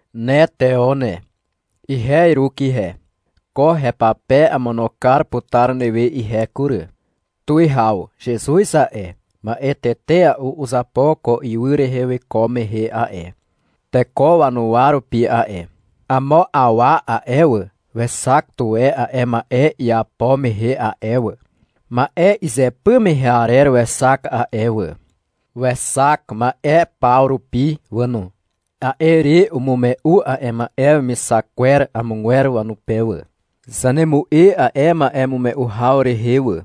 Ne Teo ne, ihe Iruk ihe. Ko hepape amono kar putar newe ihe kury, tuwihaw. Zezuz a'e, ma'e tetea'u uzapo ko ywy rehe wiko mehe a'e, teko wanuwa rupi a'e. Amo awa a'e wà, wexak tuwe a'e ma'e iapo mehe a'e wà. Ma'e izypy mehe arer wexak a'e wà. Wexak ma'e paw rupi wà no. A'e re umume'u a'e ma'e wemixak kwer amogwer wanupe wà. Zanemu'e a'e ma'emume'u haw rehe wà.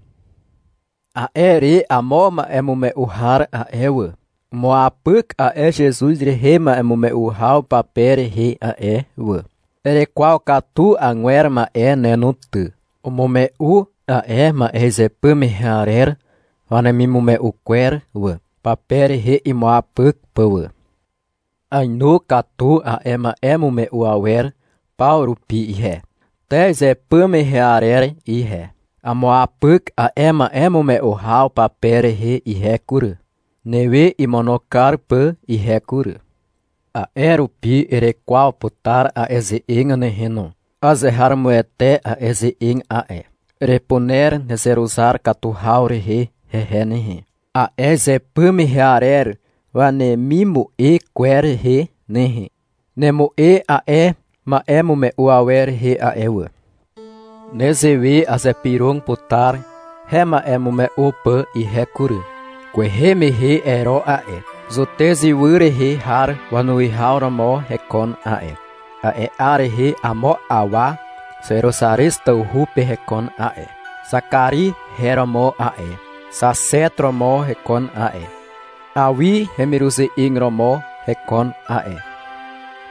A'e re amo a'e ma'emume'u har a'e wà, umuapyk a'e Zezuz rehe ma'emume'u haw pape rehe a'e wà. Erekwaw katu agwer ma'e ne no ty. Umume'u a'e ma'e izypy mehe arer wanemimume'u kwer wà, pape rehe imuapyk pà wà. Aenu katu a'e ma'emume'u awer paw rupi ihe, te izypy mehe arer ihe. Amuapyk a'e ma'emume'u haw pape rehe ihe kury, newe imono kar pà ihe kury. A'e rupi erekwaw putar a'e ze'eg ne nehe no. Azeharomoete a'e ze'eg a'e. Erepuner nezeruzar katu haw rehe hehe nehe, a'e izypy mehe arer wanemimu'e kwer rehe nehe. Nemu'e a'e ma'emume'u awer rehe a'e wà. Nezewe azypyrog putar hema'emume'u pà ihe kury. Kwehe mehe Ero a'e, Zutez ywy rehe har wanuwihaw romo hekon a'e. A'e 'ar rehe amo awa Zeruzarez tawhu pe hekon a'e. Zakari her romo a'e, xaxeto romo hekon a'e, Awi hemiruze'eg romo hekon a'e.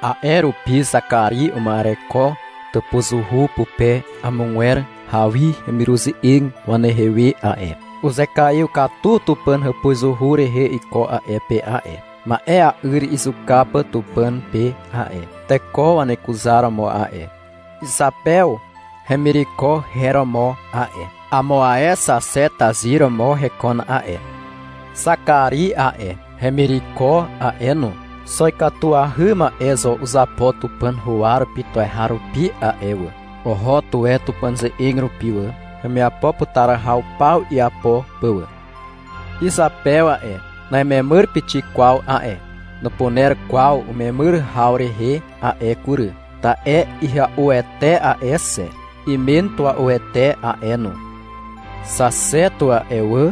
A'e rupi Zakari uma'ereko tàpuzuhu pupe amogwer Awi hemiruze'eg wanehe we a'e. Uzekaiw katu Tupàn hàpuzuhu rehe iko a'e pe a'e, ma'ea'yr izuka pà Tupàn pe a'e, teko wanekuzaromo a'e. Izapew hemireko her romo a'e. Amo ae xaxeto tazyr romo hekon a'e. Zakari a'e, hemireko a'e no, xo ikatuahy ma'e zo uzapo Tupàn huwa rupi tuweharupi a'e wà. Oho tuwe Tupàn ze'eg rupi wà, hemiapo putar haw paw iapo pà wà. Izapew a'e, na'imemyr pixik kwaw a'e. Nupuner kwaw umemyr haw rehe a'e kury, ta'e ihya'uete a'e xe. Imen tua'uete a'e no. Xaxeto a'e wà,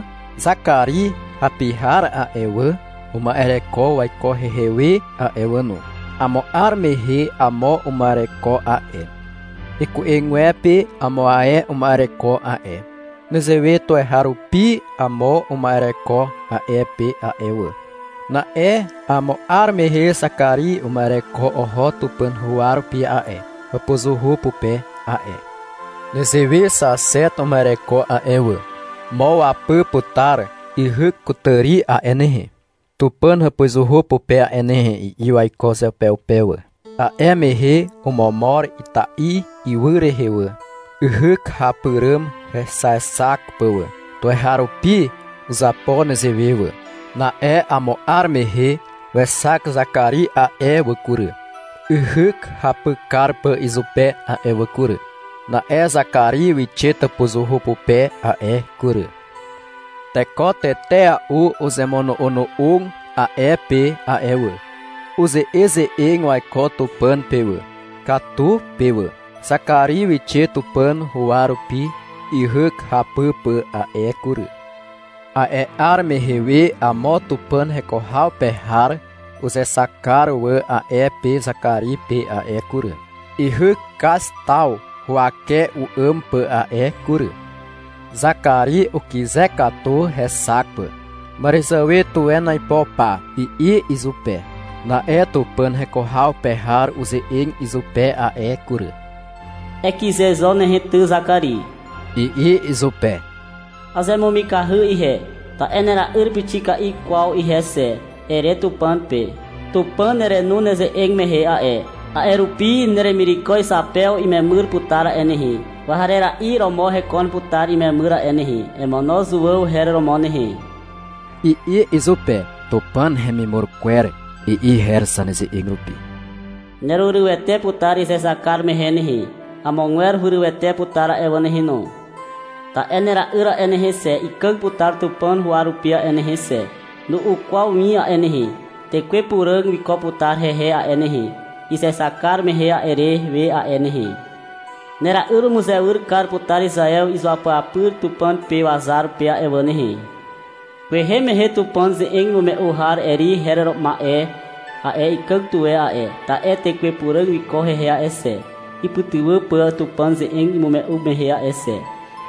Zakari hapi har a'e wà, uma'ereko waiko hehe we a'e wà no. Amo 'ar mehe amo uma'ereko a'e, iku'egwepe amo ae uma'ereko a'e. Nezewe tuweharupi amo uma'ereko a'e pe a'e wà. Na'e amo 'ar mehe Zakari uma'ereko oho Tupàn huwa rupi a'e, hàpuzuhu pupe a'e. Nezewe xaxeto uma'ereko a'e wà. Mo wapy putar yhyk kutàri a'e nehe, Tupàn hàpuzuhu pupe a'e nehe, i'i waiko uzeupeupe wà. A'e mehe omomor ita'i ywy rehe wà, yhyk hapy àràm hexaexak pà wà. Tuweharupi uzapo nezewe wà. Na'e amo 'ar mehe wexak Zakari a'e wà kury, yhyk hapy kar pà izupe a'e wà kury. Na'e Zakari wixe tàpuzuhu pupe a'e kury. Teko tetea'u uzemono'ono'og a'e pe a'e wà. Uze'eze'eg waiko Tupàn pe wà, katu pe wà. Zakari wixe Tupàn huwa rupi yhyk hapy pà a'e kury. A'e 'ar mehe we amo Tupàn heko haw pe har uzexak kar wà a'e pe Zakari pe a'e kury. Yhyk kaz taw huwake u'àm pà a'e kury. Zakari ukyze katu hexak pà. Màràzàwe tuwen aipo pa, i'i izupe. Na'e Tupàn heko haw pe har uze'eg izupe a'e kury. — Ekyze zo nehe ty, Zakari, i'i izupe. — Azemumikahy ihe, ta'e nahera'yr pixik kwaw ihe xe, ere Tupàn pe. Tupàn nerenu neze'eg mehe a'e, a'e rupi neremireko Izapew imemyr putar a'e nehe. Kwarera'i romo hekon putar imemyr a'e nehe. Emono Zuàw her romo nehe, i'i izupe. (Tupàn hemimur kwer, i'i her zaneze'eg rupi.) Nerurywete putar izexak kar mehe nehe. Amogwer hurywete putar a'e wà nehe no. Ta'e nera'yr a'e nehe xe, ikàg putar Tupàn huwa rupi a'e nehe xe. Nu'u kwaw win a'e nehe. Tekwe Puràg wiko putar hehe a'e nehe, izexak kar mehe arer we a'e nehe. Nera'yr umuzewyr kar putar Izaew izuapyapyr Tupàn pe wazar pe a'e wà nehe. Kwehe mehe Tupàn ze'eg imume'u har Eri her ma'e a'e, ikàg tuwe a'e, ta'e Tekwe Puràg wiko hehe a'e xe, ipytywà pà Tupàn ze'eg imume'u mehe a'e xe.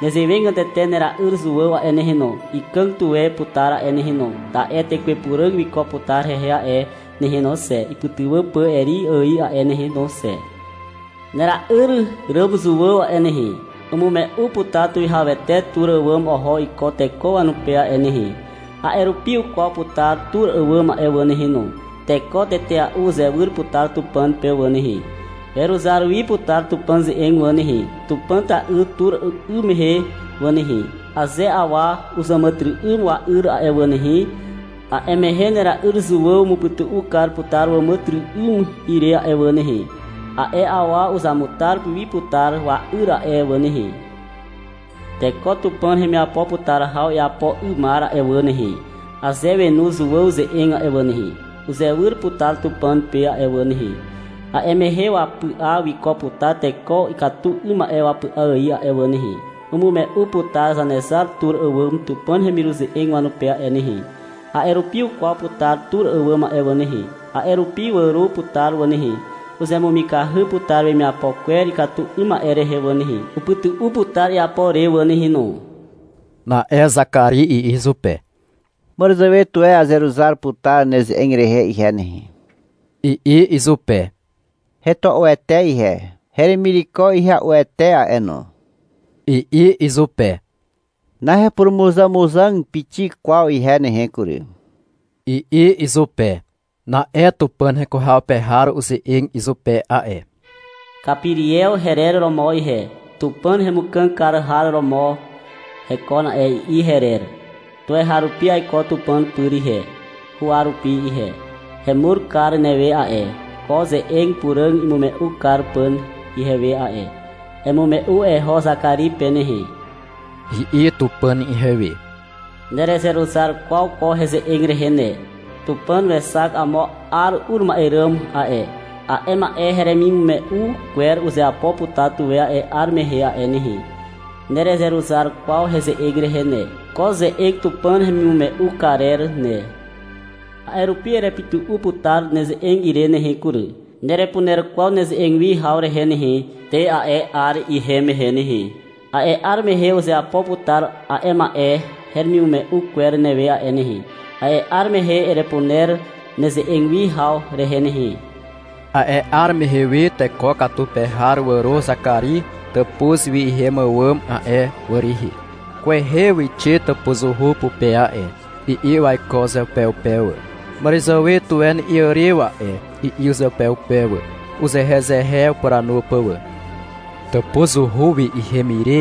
Nezewegatete nera'yr Zuàw a'e nehe no, ikàg tuwe putar a'e nehe no, ta'e Tekwe Puràg wiko putar hehe a'e nehe no xe, ipytywà pà Eri ài a'e nehe no xe. Nera'yr ràm Zuàw a'e nehe, umume'u putar Tuwihawete tur àwàm oho iko teko wanupe a'e nehe. A'e rupi ukwaw putar tur àwàm a'e wà nehe no. Teko tetea'u uzewyr putar Tupàn pe wà nehe. Weruzar wi putar Tupàn ze'eg wà nehe, Tupàn ta'yr tur 'ym mehe wà nehe. Aze awa uzàmàtyry'ym wa'yr a'e wà nehe, a'e mehe nera'yr Zuàw umupytu'u kar putar wàmàtyry'ym ire a'e wà nehe. A'e awa uzamutar wi putar wa'yr a'e wà nehe. Teko Tupàn hemiapo putar haw iapo 'ymar a'e wà nehe, aze wenu Zuàw ze'eg a'e wà nehe, uzewyr putar Tupàn pe a'e wà nehe. A'e mehe wapy'a wiko putar teko ikatu ma'e wapy'a ài a'e wà nehe. Umume'u putar Zanezar tur àwàm Tupàn hemiruze'eg wanupe a'e nehe. A'e rupi ukwaw putar tur àwàm a'e wà nehe. A'e rupi wàro putar wà nehe. Uzemumikahy putar wemiapo kwer ikatu 'ym ma'e rehe wà nehe. Upytu'u putar iapo re wà nehe no. Na'e Zakari i'i izupe. Màràzàwe tuwe azeruzar putar neze'eg rehe ihe nehe, i'i izupe. — Hetua'uete ihe, heremireko ihya'uete a'e no, i'i izupe. Nahepurumuzàmuzàg pixik kwaw ihe nehe kury, i'i izupe. Na'e Tupàn heko haw pe har uze'eg izupe a'e. Kapiriew herer romo ihe. — Tupàn hemukàg kar har romo hekon a'e, i'i herer. Tuweharupi aiko Tupàn pyr ihe, huwa rupi ihe. Hemur kar newe a'e, ko ze'eg puràg imume'u kar pà ihewe a'e. Emume'u eho Zakari pe nehe, i'i Tupàn ihewe. Nerezeruzar kwaw ko heze'eg rehe ne. Tupàn wexak amo 'ar ur ma'e ràm a'e. A'e ma'e heremimume'u kwer uzeapo putar tuwe a'e 'ar mehe a'e nehe. Nerezeruzar kwaw heze'eg rehe ne, ko ze'eg Tupàn hemimume'u karer ne. A'e rupi erepytu'u putar neze'eg ire nehe kury. Nerepuner kwaw neze'eg wi haw rehe nehe, te a'e 'ar ihem mehe nehe. A'e 'ar mehe uzeapo putar a'e ma'e heremimume'u kwer newe a'e nehe. A'e 'ar mehe erepuner neze'eg wi haw rehe ne nehe. A'e 'ar mehe we teko katu pe har wàro Zakari tàpuz wi ihem àwàm a'e wà rihi. — Kwehe wixe tàpuzuhu pupe a'e, i'i waiko uzeupeupe wà. — Màràzàwe tuwe iàrew a'e, i'i uzeupeupe wà, uzehezehe upuranu pà wà. Tàpuzuhu wi ihem ire,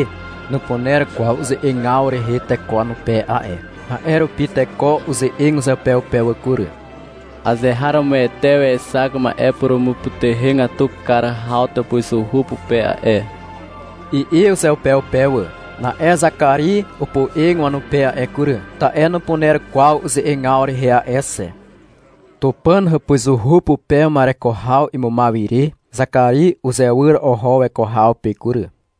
nupuner kwaw uze'egaw rehe teko wanupe a'e. A'e rupi teko uze'eg uzeupeupe wà kury. — Azeharomoete wexak ma'e purumupytuhegatu kar haw tàpuzuhu pupe a'e, i'i uzeupeupe wà. Na'e Zakari opoe'eg wanupe a'e kury, ta'e nupuner kwaw uze'egaw rehe a'e xe. Tupàn hàpuzuhu pupe uma'ereko haw imumaw ire Zakari uzewyr oho weko haw pe kury.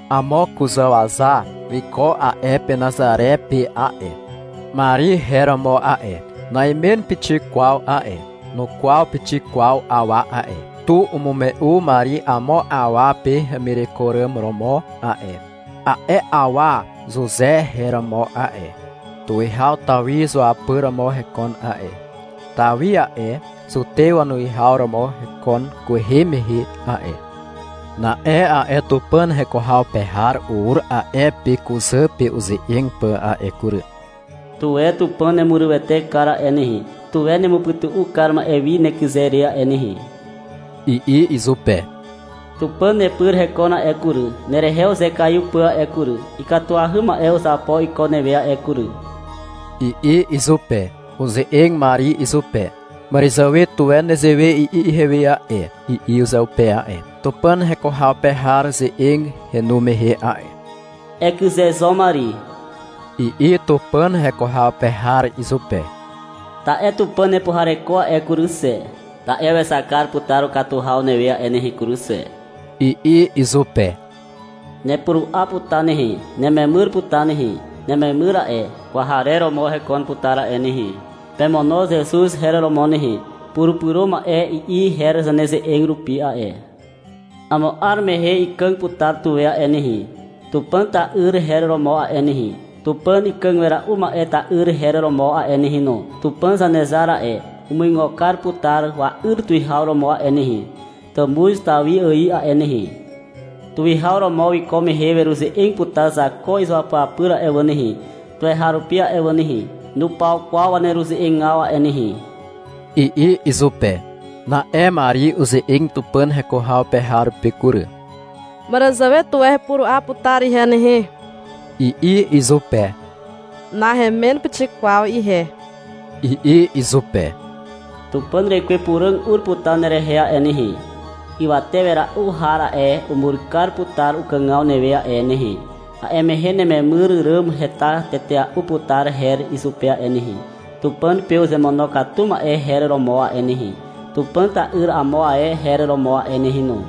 Amo kuzàwaza wiko a'e pe Nazare pe a'e. Mari her romo a'e, na'imen pixik kwaw a'e. Nukwaw pixik kwaw awa a'e. Tu umume'u Mari amo awa pe hemireko ràm romo a'e. A'e awa Zuze her romo a'e. Tuwihaw Tawi zuapyr romo hekon a'e. (Tawi a'e, Zutew wanuwihaw romo hekon kwehe mehe a'e.) Na'e a'e Tupàn heko haw pe har ur a'e pe kuzà pe uze'eg pà a'e kury. — Tuwe Tupàn nemurywete kar a'e nehe, tuwe nemupytu'u kar ma'e wi nekyze re a'e nehe, i'i izupe. — Tupàn nepyr hekon a'e kury, nerehe uzekaiw pà a'e kury. Ikatuahy ma'e uzapo iko newe a'e kury, i'i izupe. Uze'eg Mari izupe. — Màràzàwe tuwe nezewe i'i ihewe a'e, i'i uzeupe a'e, Tupàn heko haw pe har ze'eg henu mehe a'e. — Ekyze zo, Mari, i'i Tupàn heko haw pe har izupe. — Ta'e Tupàn nepuhareko a'e kury xe, ta'e wexak kar putar ukatu haw newe a'e nehe kury xe, i'i izupe. — Nepuru'a putar nehe, nememyr putar nehe. Nememyr a'e, kwarer romo hekon putar a'e nehe. Pemono Zezuz her romo nehe. (Purupyro ma'e, i'i her zaneze'eg rupi a'e.) Amo 'ar mehe ikàg putar tuwe a'e nehe. Tupàn ta'yr her romo a'e nehe. Tupàn Ikàg Wera'u Ma'e ta'yr her romo a'e nehe no. Tupàn Zanezar a'e, umuigo kar putar wa'yr tuwihaw romo a'e nehe, tàmuz Tawi ài a'e nehe. Tuwihaw romo wiko mehe weruze'eg putar Zako izuapyapyr a'e wà nehe, tuweharupi a'e wà nehe. Nupaw kwaw waneruze'egaw a'e nehe, i'i izupe. Na'e Mari uze'eg Tupàn heko haw pe har pe kury. — Màràzàwe tuwe hepuru'a putar ihe nehe, i'i izupe. — Nahemen pixik kwaw ihe, i'i izupe. Tupàn rekwe Puràg ur putar nerehe a'e nehe. Ywate wera'u har a'e, umur kar putar ukàgaw newe a'e nehe. A'e mehe nememyr ràm heta tetea'u putar her izupe a'e nehe. Tupàn pe uzemonokatu ma'e her romo a'e nehe. Tupàn ta'yr amo ae her romo a'e nehe no.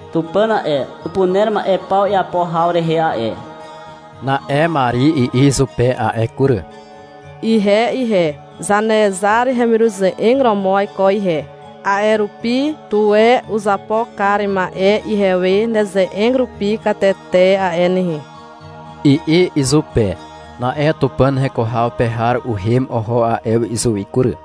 Tupàn a'e, upuner ma'e paw iapo haw rehe a'e. Na'e Mari i'i izupe a'e kury. — Ihe ihe, Zanezar hemiruze'eg romo aiko ihe. A'e rupi, tuwe uzapo kar ma'e ihewe neze'eg rupi katete a'e nehe, i'i izupe. Na'e Tupàn heko haw pe har uhem oho a'e wi izuwi kury.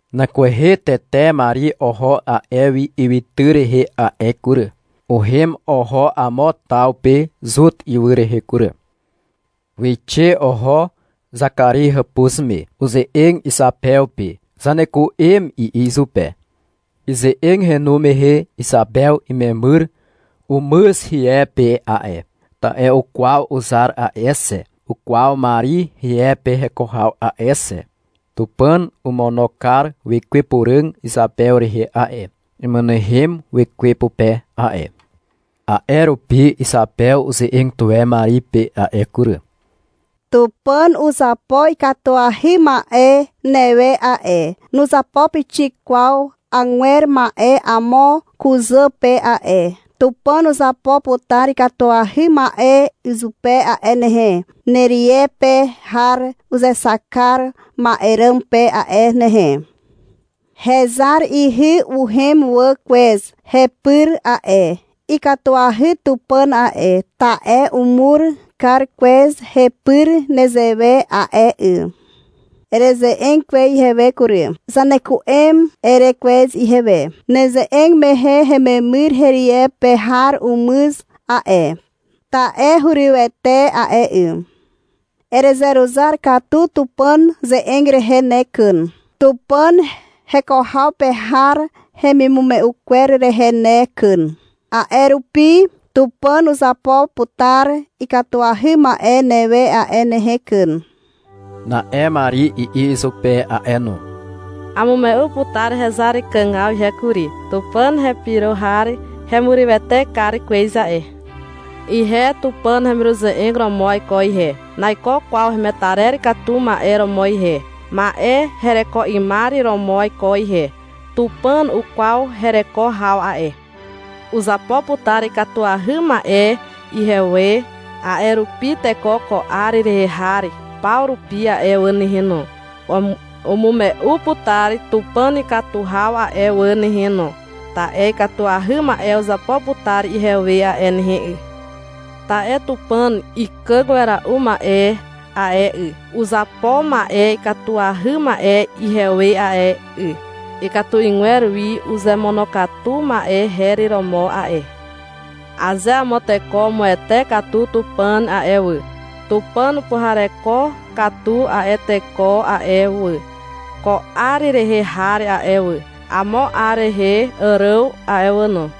Nan kwehe tete Mari oho a'e wi ywytyr rehe a'e kury. Uhem oho amo taw pe Zuta ywy rehe kury. Wixe oho Zakari hàpuz me. Uze'eg Izapew pe. — Zaneku'em, i'i izupe. Ize'eg henu mehe Izapew imemyr umyz hie pe a'e. (Ta'e ukwaw uzar a'e xe, ukwaw Mari rie pe heko haw a'e xe.) Tupàn omono kar Wekwe Puràg Izapew rehe a'e. Umynehem wekwe pupe a'e. A'e rupi Izapew uze'eg tuwe Mari pe a'e kury. — Tupàn uzapo ikatuahy ma'e newe a'e. Nuzapo pixik kwaw agwer ma'e amo kuzà pe a'e. Tupàn uzapo putar ikatuahy ma'e izupe a'e nehe, nerie pe har uzexak kar ma'e ràm pe a'e nehe. Hezar ihy uhem wà kwez hepyr a'e. Ikatuahy Tupàn a'e, ta'e umur kar kwez hepyr nezewe a'e 'y. Ereze'eg kwez ihewe kury. — Zaneku'em, ere kwez ihewe. Neze'eg mehe hememyr herie pe har umyz a'e, ta'e hurywete a'e 'y Erezeruzar katu Tupàn ze'eg rehe ne kyn, Tupàn heko haw pe har hemimume'u kwer rehe ne kyn, a'e rupi Tupàn uzapo putar ikatuahy ma'e newe a'e nehe kyn, Na'e Mari i'i izupe a'e no. — Amume'u putar hezar ikàgaw ihe kury. Tupàn hepyro har hemurywete kar kwez a'e. Ihe Tupàn hemiruze'eg romo aiko ihe, naiko kwaw hemetarer katu ma'e romo ihe, ma'e hereko 'ymar romo aiko ihe. Tupàn ukwaw hereko haw a'e. Uzapo putar ikatuahy ma'e ihewe a'e nehe kury. A'e rupi teko ko 'ar rehe har paw rupi a'e wà nehe no, umume'u putar Tupàn ikatu haw a'e wà nehe no, ta'e ikatuahy ma'e uzapo putar ihewe a'e nehe 'y. Ta'e Tupàn Ikàg Wera'u Ma'e a'e 'y, uzapo ma'e ikatuahy ma'e ihewe a'e 'y. Ikatu 'ygwer wi uzemonokatu ma'e her romo a'e. Aze amo teko umuwete katu Tupàn a'e wà, Tupàn upuhareko katu a'e teko a'e wà, ko 'ar rehe har a'e wà, amo 'ar rehe àràm a'e wà no.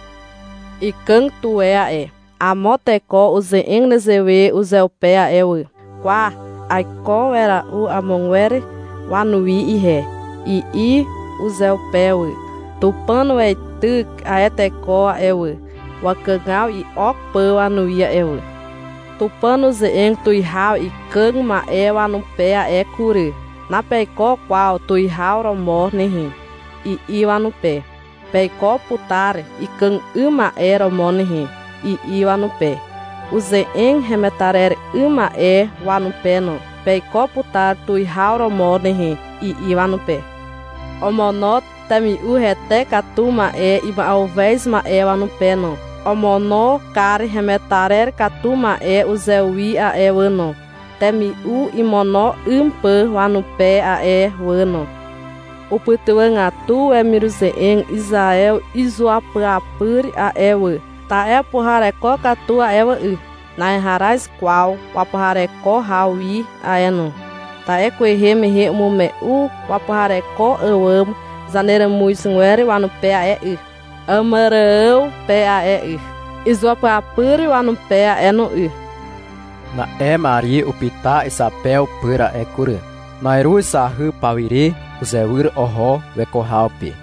Ikàg tuwe a'e. Amo teko uze'eg nezewe uzeupe a'e wà, — Kwa, aiko wera'u amogwer wanuwi ihe, i'i uzeupe wà. Tupàn weityk a'e teko a'e wà, wakàgaw i'ok pà wanuwi a'e wà. Tupàn uze'eg tuwihaw ikàg ma'e wanupe a'e kury. — Napeiko kwaw tuwihaw romo nehe, i'i wanupe. — Peiko putar ikàg 'ym ma'e romo nehe, i'i wanupe. Uze'eg hemetarer 'ym ma'e wanupe no. — Peiko putar tuwihaw romo nehe, i'i wanupe. Omono temi'u hete katu ma'e ima'uhez ma'e wanupe no. Omono kar hemetarer katu ma'e uzewi a'e wà no, temi'u imono 'ym pà wanupe a'e wà no. Upytywàgatu wemiruze'eg Izaew izuapyapyr a'e wà, ta'e upuhareko katu a'e wà 'y. Naheharaz kwaw wapuhareko haw wi a'e no. Ta'e kwehe mehe umume'u wapuhareko àwàm zaneràmuzgwer wanupe a'e 'y, Àmàrààw pe a'e 'y, izuapyapyr wanupe a'e no 'y. Na'e Mari upyta Izapew pyr a'e kury. Na'iruz zahy pawire uzewyr oho weko haw pe.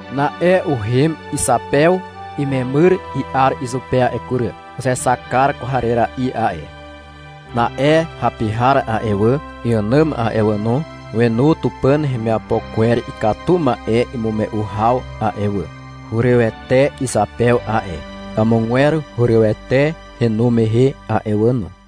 Na'e uhem Izapew imemyr i'ar izupe a'e kury. Uzexak kar kwarera'i a'e. Na'e hapi har a'e wà, iànàm a'e wà no, wenu Tupàn hemiapo kwer ikatu ma'e imume'u haw a'e wà. Hurywete Izapew a'e. Amogwer hurywete henu mehe a'e wà no.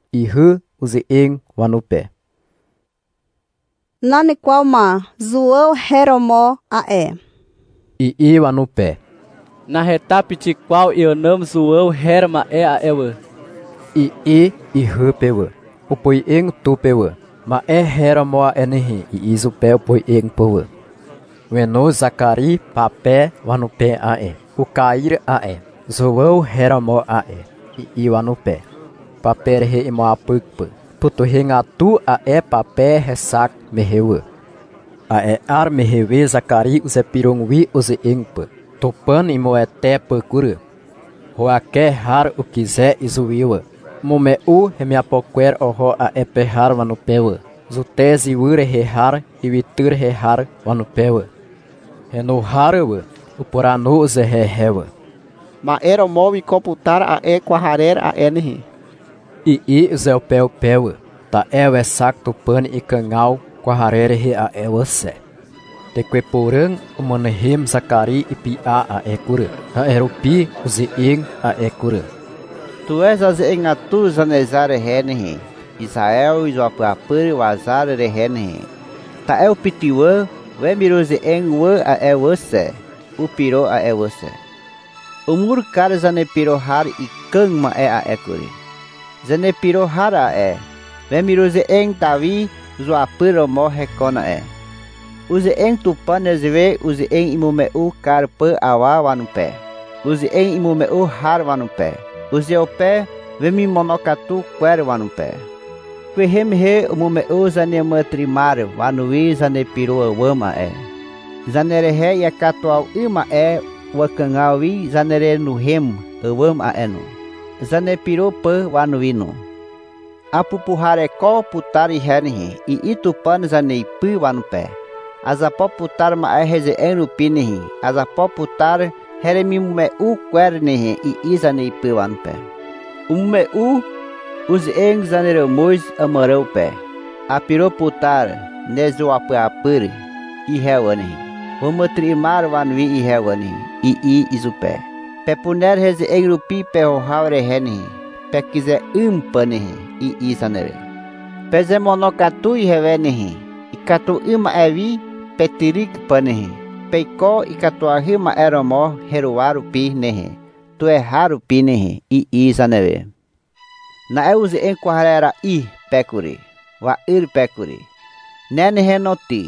Ihy uze'eg wanupe. — Nan kwaw ma. Zuàw her romo a'e, i'i wanupe. — Naheta pixik kwaw iànàm Zuàw her ma'e a'e wà, i'i ihy pe wà. Opoe'eg tu pe wà. — Ma'e her romo a'e nehe, i'i izupe opoe'eg pà wà. Wenoz Zakari pape wanupe a'e. Ukair a'e. — Zuàw her romo a'e, i'i wanupe, pape rehe imuapyk pà. Ipytuhegatu a'e pape hexak mehe wà. A'e 'ar mehe we Zakari uzypyrog wi uze'eg pà, Tupàn imuwete pà kury. Huwake har ukyze izuwi wà. Umume'u hemiapo kwer oho a'e pe har wanupe wà, Zutez ywy rehe har ywytyr rehe har wanupe wà. Henu har wà, upuranu uzehezehe wà. — Ma'e romo wiko putar a'e kwarer a'e nehe, i'i uzeupeupe wà. Ta'e wexak Tupàn ikàgaw kwarer rehe a'e wà xe. Tekwe Puràg umynehem Zakari ipy'a a'e kury. A'e rupi uze'eg a'e kury. — Tuwe zaze'egatu Zanezar rehe nehe, Izaew izuapyapyr wazar rehe nehe. Ta'e upytywà wemiruze'eg wà a'e wà xe. Upyro a'e wà xe. Umur kar zanepyro har ikàg ma'e a'e kury. Zanepyro har a'e, wemiruze'eg Tawi zuapyr romo hekon a'e. Uze'eg Tupàn nezewe uze'eg imume'u kar pà awa wanupe, uze'eg imume'u har wanupe, uzeupe wemimonokatu kwer wanupe. — Kwehe mehe umume'u zaneàmàtyry'ymar wanuwi zanepyro àwàm a'e, zanerehe iakatuwaw 'ym ma'e wakàgaw wi zanerenuhem àwàm a'e no, zanepyro pà wanuwi no. — Apupuhareko putar ihe nehe, i'i Tupàn zaneipy wanupe. — Azapo putar ma'e heze'eg rupi nehe, azapo putar heremimume'u kwer nehe, i'i zaneipy wanupe. Umume'u uze'eg zaneràmuz Àmàrààw pe. — Apyro putar nezuapyapyr ihe wà nehe, wàmàtyry'ymar wanuwi ihe wà nehe, i'i izupe. — Pepuner heze'eg rupi peho haw rehe nehe, pekyze 'ym pà nehe, i'i zanewe. — Pezemonokatu ihewe nehe, ikatu 'ym ma'e wi petyryk pà nehe, peiko ikatuahy ma'e romo heruwa rupi nehe, tuweharupi nehe, i'i zanewe. Na'e uze'eg kwarera'i pe kury, wa'yr pe kury. — Ne nehe no ty,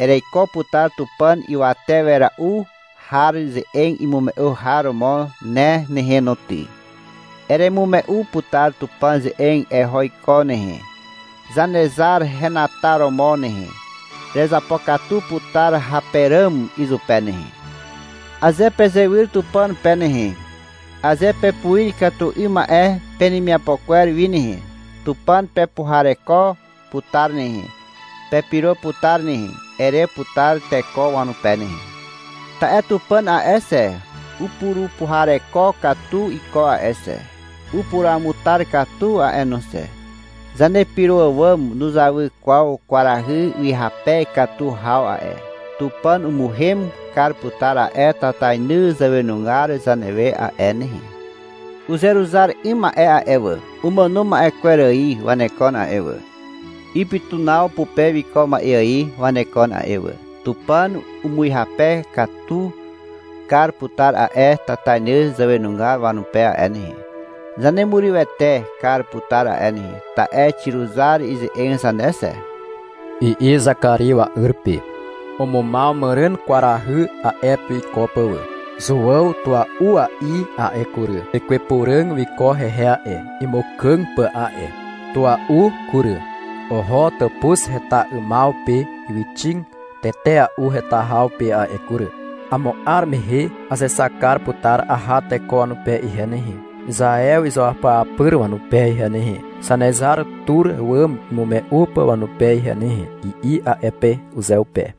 ereiko putar Tupàn Ywate Wera'u Har ze'eg imume'u har romo ne nehe no ty. Eremume'u putar Tupàn ze'eg eho iko nehe, Zanezar henataromo nehe. Erezapokatu putar hape ràm izupe nehe. — Aze pezewyr Tupàn pe nehe, aze pepuir ikatu 'ym ma'e penemiapo kwer wi nehe, Tupàn pepuhareko putar nehe, pepyro putar nehe, ere putar teko wanupe nehe. Ta'e Tupàn a'e xe, upurupuhareko katu iko a'e xe, upuruamutar katu a'e no xe. Zanepyro àwàm nuzawy kwaw kwarahy ihyape katu haw a'e. Tupàn umuhem kar putar a'e tatainy zàwenugar zanewe a'e nehe. Uzeruzar 'ym ma'e a'e wà, umàno ma'e kwer ài wanekon a'e wà, ipytunaw pupe wiko ma'e ài wanekon a'e wà. Tupàn umuhyape katu kar putar a'e tatainy zàwenugar wanupe a'e nehe. Zanemurywete kar putar a'e nehe, ta'e xiruzar ize'eg zane xe, i'i Zakari wa'yr pe. Umumaw màràn kwarahy a'e pe wiko pà wà. Zuàw tua'ua'i a'e kury. Tekwe Puràg wiko hehe a'e, imukàg pà a'e. Tua'u kury. Oho tàpuz heta 'ymaw pe ywyxig tetea'u heta haw pe a'e kury. — Amo 'ar mehe azexak kar putar aha teko wanupe ihe nehe, Izaew izuapyapyr wanupe ihe nehe, Zanezar tur àwàm imume'u pà wanupe ihe nehe, i'i a'e pe uzeupe.